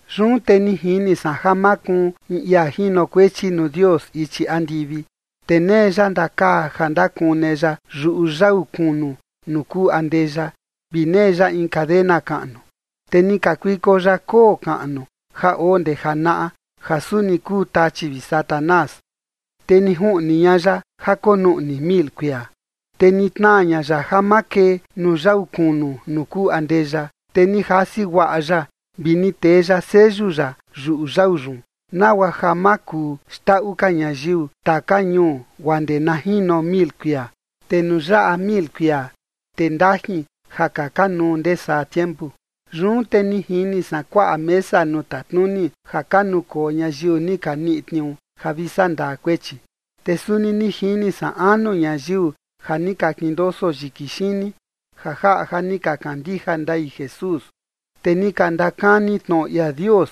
Yun te ni jini san ja makuun in ia jinokuechi nuu Dios ichi andivi, te nee ya ndakaa ja ndakune ya yuꞌu yau kunu nuu kuu andeya vi nee ya in cadena kaꞌnu. Te ni kakuiko ya koo kaꞌnu ja oo ndee janaꞌa, ja suni kuu Tachi vi Satanás. Te ni juꞌni ña ya ja konuꞌni mil kuia. Te ni tnaa ña ya ja ma kee nuu yau kunu nuu kuu andeya, te ni jasi guaꞌa ya vi ni tee ya seyu ya yuꞌu yau yun, nagua ma kuu xndaꞌu ka ñayiu taka ñuu guaa ndee na jino mil kuia. Te nuu yaꞌa mil kuia, te ndajin ja kaka nuu ndee saa tiempu. Yun te ni jini san kuaꞌa mesa nuu tatnuni ja ka nukoo ñayiu ni ka niꞌi tniuu ja vi sandaa kuechi. Te suni ni jini san anu ñayiu ja ni ka kindoso yiki xini, ja jaꞌa ja ni ka kandija ndai Jesús, te ni ka ndakani tnoꞌo ia Dios.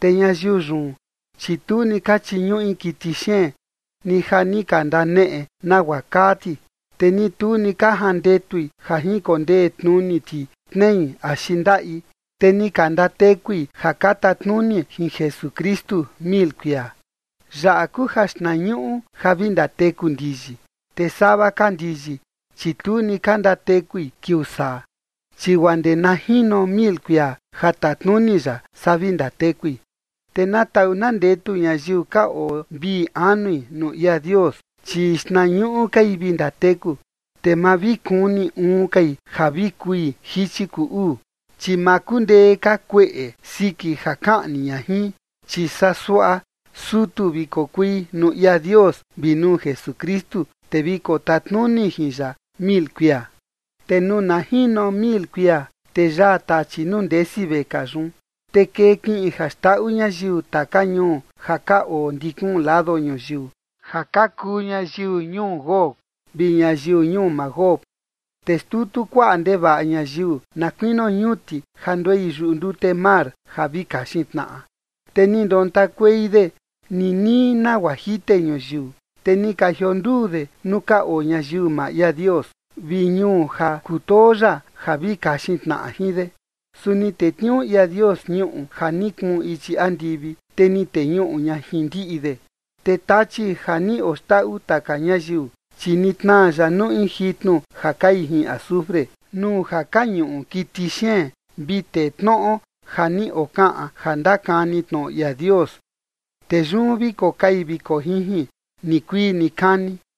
Te ñayiu yun, chi tu ni ka chiñuꞌi kiti xeen, ni ja ni ka ndaneꞌe nagua kaa ti, te ni tu ni ka jandetui ja jinkondee tnuni ti tnei axi ndaꞌi. Te ni ka ndatekui ja ka tatnuni jin Jesukristu mil kuia. Yaꞌa kuu jaxtnañuꞌu ja vi ndateku ndiyi, te sava ka ndiyi, chi tu ni ka ndatekui kiuu saa, chi guaa ndee na jino mil kuia ja tatnuni ya, saa vi ndatekui. Te na taꞌu na ndetu ñayiu ka oo vii anui nuu ia Dios, chi xtnañuꞌu kai vi ndateku. Te ma vi kuni uun kai ja vi kui jichi kuu uu, chi ma kundee ka kueꞌe siki ja kaꞌni ña jin, chi saa suaꞌa sutu vi kokui nuu ia Dios vi nuu Jesukristu, te vi kotatnuni jin ya mil kuia. Te nuu na jino mil kuia, te yaa Tachi nuu ndesi vekaa yun. Te kee kiꞌin ja xndaꞌu ñayiu taka ñuu ja ka oo ndi kuun lado ñuyiu, ja ka kuu ñayiu ñuu Gog vi ñayiu ñuu Magog, te xtutu kuaꞌa ndevaꞌa ñayiu na kuinio ñuti ja nduei yuꞌu ndute mar, ja vi kaxin tnaꞌa. Te ni ndontakuei de ninii nagua jite ñuyiu, te ni ka jionduu de nuu ka oo ñayiu maa ia Dios vi ñuu ja kutoo ya ja vi kaxin tnaꞌa jin de. Su ni tetniuu ia Dios ñuꞌu ja ni kuun ichi andivi, te ni teñuꞌu ña jin ndiꞌi de. Te Tachi ja ni oxndaꞌu taka ñayiu, chi ni tnaa ya nuu in jitnu ja kai jin azufre, nuu ja ka ñuꞌu kiti xeen vi tee tnoꞌo ja ni okaꞌan ja ndakani tnoꞌo ia Dios, te yun vi kokai vi kojinjin nikuii nikani.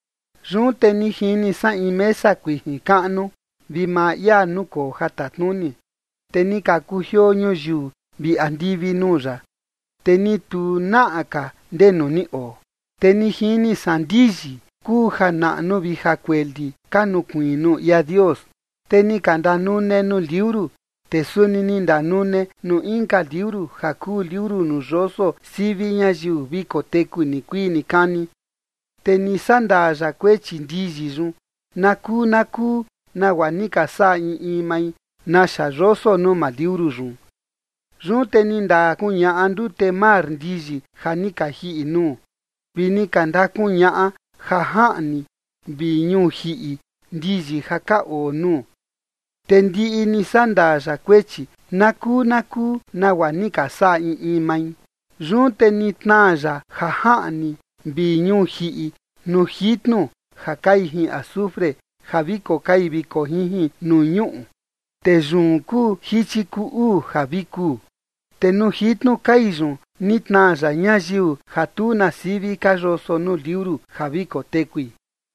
Yun te ni jini san in mesa kuijin kaꞌnu, vi maa ia nukoo ja tatnuni. Te ni ka kujioo ñuyiu vi andivi nuu ya, te ni tu naꞌa ka ndenu ni oo. Te ni jini san ndiyi kuu ja naꞌnu vi ja kueli ka nukuiin nuu ia Dios. Te ni ka ndanune nuu liuru, te suni ni ndanune nuu inka liuru ja kuu liuru nuu yoso sivi ñayiu vi koteku nikuii nikani. Te ni sandaa ya kuechi ndiyi yun, nakuu nakuu nagua ni ka saꞌa in in mai, naxa yoso nuu maa liuru yun. Yun te ni ndakuñaꞌa ndute mar ndiyi ja ni ka jiꞌi nuu, vi ni ka ndakuñaꞌa jajaꞌni vi ñuu jiꞌi ndiyi ja ka oo nuu, te ndiꞌi ni sandaa ya kuechi, nakuu nakuu nagua ni ka saꞌa in in mai. Yun te ni tnaa ya ja jaꞌni vi ñuu jiꞌi nuu jitnu ja kai jin azufre ja vi kokai vi kojinjin nuu ñuꞌu, te yun kuu jichi kuu uu ja vi kuu. Te nuu jitnu kai yun ni tnaa ya ñayiu ja tu na sivi ka yoso nuu liuru ja vi kotekui.